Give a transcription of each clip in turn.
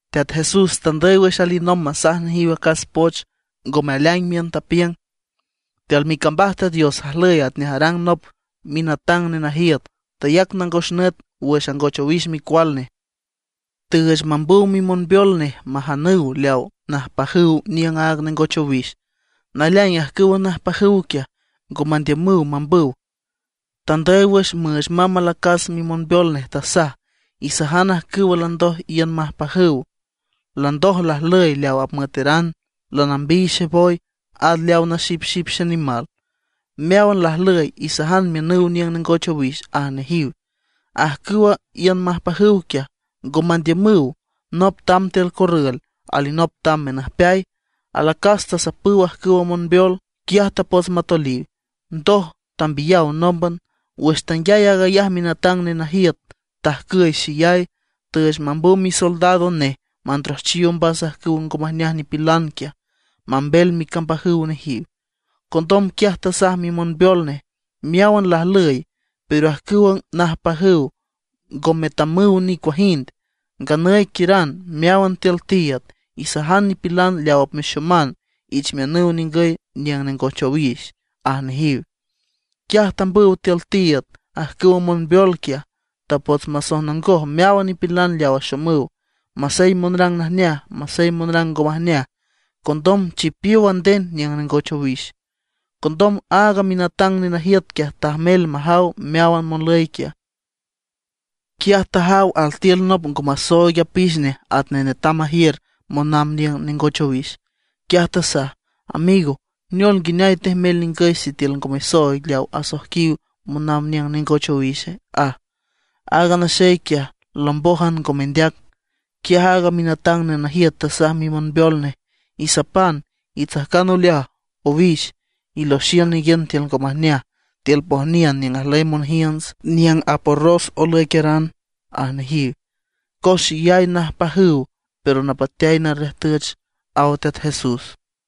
Teat Jesús tandüy wüx alinomb masaj nejiw acas poch ngome aleaing miün, tapiüng: ―Tiül micambaj Teat Dios ajlüy atnej arang nop minatang nenajiüt, tayac nangos nüt wüx angoch owix micual nej. Tüüch mambüw mimonbeol nej majanüw leaw najpajüw niüng aaga nengoch owix. Naleaing ajcüwa najpajüw quiaj, ngo mandiümüw mambüw. Tandüy wüx müüch mamb alacas mimonbeol nej, tasaj: “Isajan ajcüwa landoj iün majpajüw: Landoj lajlüy leaw apmüeteran, lanambiy xeboy, at leaw naxipxip xenimal. Meáwan lajlüy, isajan miünüw niüng nengoch owix”, aj nejiw. Ajcüwa iün majpajüw quiaj, ngo mandiümüw. Nop tamb tiül corrül, alinop tamb menüjpeay. Alacas tasapüw ajcüwa monbeol, quiaj tapots matoliw, ndoj tambiyaw nómban. Wüx tanguiay aag ayaj a minatang nenajiüt tajcüy xeyay, tüüch mambüw misoldados nej mandrojchiw ombas ajcüwa ngo majneaj nipilan quiaj, mambel micambajüw nejiw. Condom quiaj tasaj mimonbeol nej: “Meáwan lajlüy, pero ajcüwa najpajüw ngo metamüw nicuajind. Nganüy quiüran meáwan tiül tiiüd, isajan nipilan leaw apmexoman ich miünüw ningüy niüng nengoch owix”, aj nejiw. Quiaj tambüw tiül tiiüd ajcüwa monbeol quiaj, tapots masojnongoj meáwan nipilan leaw axomüw, masey monrang najneaj, masey monrang ngo majneaj. Condom chipiow a nden niüng nengoch owix. ’Condom aaga minatang nenajiüt quiaj tajmel majaw meáwan monlüy quiaj. Quiaj tajaw altiül nop ngo masooig apix nej atnej netam majiür monamb niüng nengoch owix. Quiaj tasaj: “Amigo, ¿neol nguineay tejmel ningüy sitiül ngo mesooig leaw asoijquiw monamb niüng nengoch owixe?” aj. Aaga naxey quiaj lombójan, ngo mendeac. Quiaj aaga minatang nenajiüt tasaj mimonbeol nej: “Isapan, itsajcan oleaj owix, iloxiün ninguiün tiül ngo majneaj tiül pojniün niüng ajlüy monjiünts, niüng aporros olüiqueran”, aj nejiw. Cos xeyay najpajüw, pero napateay narriüjtüch ―aw Teat Jesús.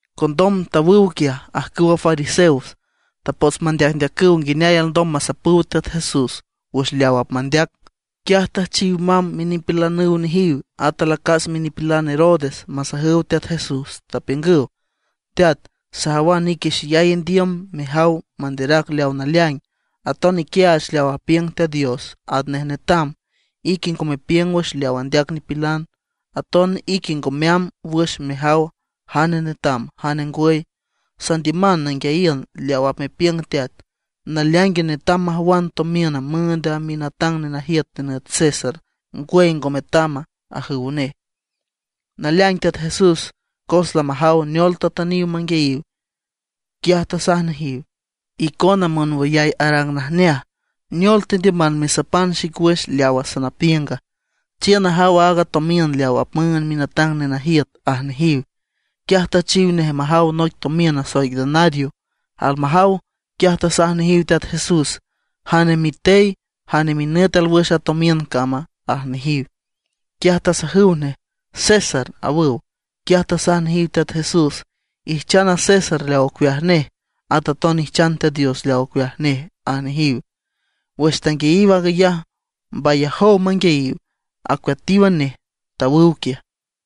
Condom tawüw quiaj ajcüwa fariseos, tapots mandeacndeacüw nguineay alndom masapüw Teat Jesús wüx leaw apmandeac. Quiaj tüjchiw mamb minipilanüw nejiw at alacas minipilan Herodes masajüw Teat Jesús, tapiüngüw: ―Teat, sajawan ique xeyay indiüm mejaw manderac leaw naleaing, aton iquiaach leaw apiüng Teat Dios atnej netam. Ique ngo mepiüng wüx leaw andeac nipilan. Aton ique ngo meamb wüx mejaw jane netam jane ngwüy. Sandiüman nanguiayiün leaw apmepiüng Teat. ¿Naleaingue netam majwan tomiün müünd a minatang nenajiüt nenüt César, ngwüy ngo metama? ―ajüw nej. Naleaing Teat Jesús cos lamajaw neol tatüniw manguiayiw, quiaj tasaj nejiw: ―¡Icona monwüyay arang najneaj! ¿Neol tendiüman mesapan xic wüx leawa sanapiünga? Chiün najaw aaga tomiün leaw apmüünd minatang nenajiüt ―aj nejiw. Quiaj tüjchiw nej majaw noic tomiün nasoic denario. Almajaw, quiaj tasaj nejiw Teat Jesús: ―¿Jane mitey, jane minüt alwüx a tomiün cama? ―aj nejiw. Quiaj tasajüw nej: ―César ―awüw. Quiaj tasaj nejiw Teat Jesús: ―Ijchan a César leaw ocueaj nej, at aton ijchan Teat Dios leaw ocueaj nej ―aj nejiw. Wüx tanguiayiw aag ayaj mbayajow manguiayiw, acueatíwan nej, tawüw quiaj.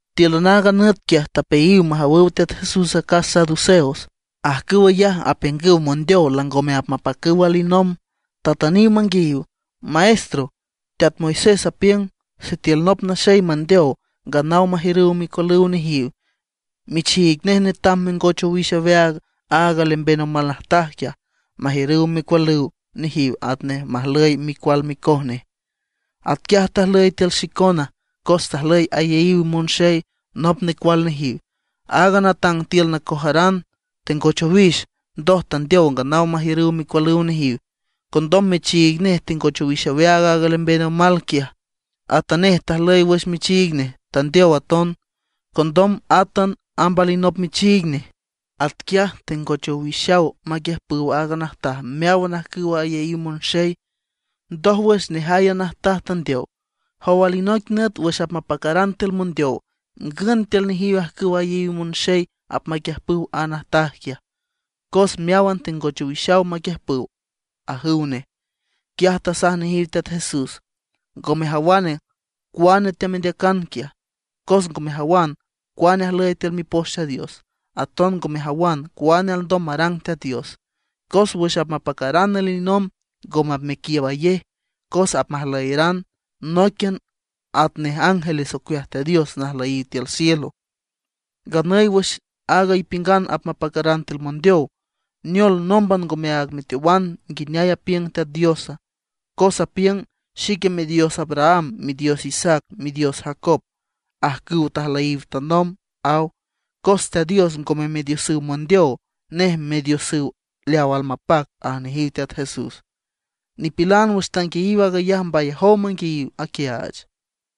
Tíülan aaga nüt quiaj tapeayiw majawüw Teat Jesús acas saduceos. Ajcüw ayaj apiüngüw mondeow langome apmapacüw alinomb. Tatüniw manguiayiw: ―Maestro, teat Moisés apiüng sitiül nop naxey mandeow, nganaw majiürüw micualüw nejiw, michiig nej netam mengoch owix aweaag aaga lemben omal najtaj quiaj, majiürüw micualüw nejiw atnej majlüy micual micoj nej. Atquiaj tajlüy tiül xicona, cos tajlüy ayaíw monxey nop necual nejiw. Aaga natang tiül nacojaran tengoch owix, ndoj tandeow nganaw majiürüw micualüw nejiw. Condom michiig nej tengoch owix aweaag aaga lemben omal quiaj. Atanej tajlüy wüx michiig nej, tandeow aton. Condom átan amb alinop michiig nej. Atquiaj tengoch owixaw maquiüjpüw aaga najtaj meáwan ajcüwa ayaíw monxey. Ndójwüx, nejay a najtaj tandeow. Jow alinoic nüt wüx apmapacaran tiül mondeow, ¿ngün tiül nejiw ajcüwa ayaíw monxey apmaquiüjpüw aaga najtaj quiaja, cos meáwan tengoch owixaw maquiüjpüw? ―ajüw nej. Quiaj tasaj nejiw Teat Jesús: ―¡Ngo mejawan cuane teamendeacan quiaj, cos ngo mejawan cuane ajlüy tiül Mipoch Teat Dios; aton ngo mejawan cuane alndom marang Teat Dios! Cos wüx apmapacaran alinomb ngome apmequiiübayej, cos apmajlüyeran nóiquian atnej ángeles ocueaj Teat Dios najlüyiw tiül cielo. Nganüy wüx aaga ipiüngan apacaran tiül mondeow, ¿neol, nómban ngomeaag meteowana nguineay apiüng Teat Diosa? Cos apiüng: “Xique Midios Abraham, Midios Isaac, Midios Jacob, ajcüw tajlüyiw tanomb”, aw. Cos Teat Dios ngome Midiosüw mondeow, nej Midiosüw leaw almapac ―aj nejiw Teat Jesús. Nipilan wüx tanguiayiw aag ayaj mbayajow manguiayiw aquiaach.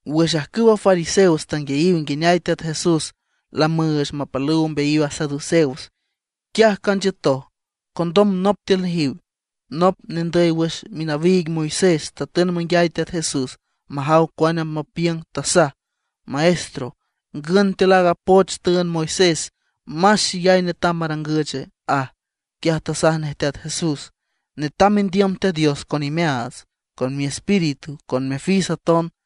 Wüx ajcüwa fariseos tanguiayiw nguineay Teat Jesús lamüüch mapalüw ombeayiw a saduceos, quiaj canchiütoj. Condom nop tiül nejiw, nop nendüy wüx minawiig Moisés, tatün manguiay Teat Jesús majaw cuane apmapiüng, tasaj: ―Maestro, ¿ngün tiül aaga poch tüünd Moisés más xeyay netam marangüche? ―aj. Quiaj tasaj nej Teat Jesús: ―“Netam mendiüm Teat Dios con imeaats, con miespíritu, con mifis aton.”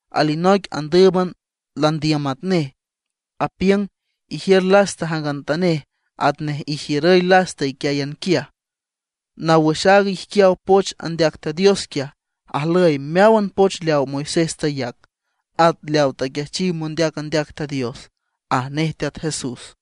Alinoic andǘüban landiüm atnej, apiüng: “Ijiür lasta jangantanej atnej ijiürüy lasta iquiáyan quiaj”. Naw wüx aaga ijquiaw poch andeac Teat Dios quiaj, ajlüy meáwan poch leawa Moisés tayac, at leaw taquiajchiw mondeac andeac Teat Dios ―aj nej Teat Jesús.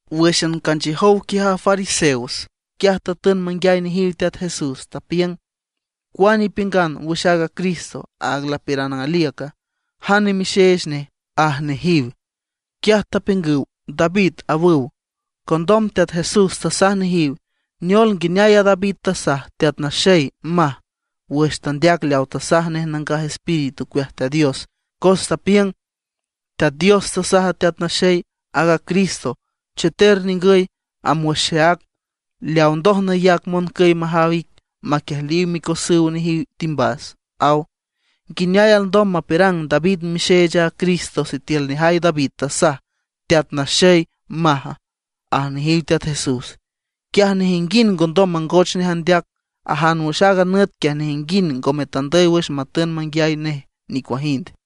Wǘxan canchiüjow quiaj a fariseos, quiaj tatün manguiay nejiw Teat Jesús. Tapiüng: ―¿Cuane ipiüngan wüx aaga Cristo, aag lapiürang aliüca? ¿Jane mixeech neje? ―aj nejiw. Quiaj tapiüngüw: ―David ―awüw. Condom Teat Jesús tasaj nejiw: ―Neol, nguineay a David tasaj: “Teat Naxey”, maj, wüx tandeac leaw tasaj nej Nangaj Espíritu ocueaj Teat Dios, cos tapiüng: Teat Dios tasaj a Teat Naxey, aaga Cristo: “Cheter ningüy amb wüx xeác, leaw ndoj nayac moncüy majaw ic maquiejliw micosüw nejiw timbas”, aw. ¿Nguineay alndom mapiürang David mixeech aaga Cristo, sitiül nejay David tasaj: “Teat Naxey”, maja? ―aj nejiw Teat Jesús. Quiaj nejinguind ngondom mangoch nej andeac. Ajan wüx aaga nüt quiaj nejinguind ngome tandüy wüx matün manguiay nej nicuajind.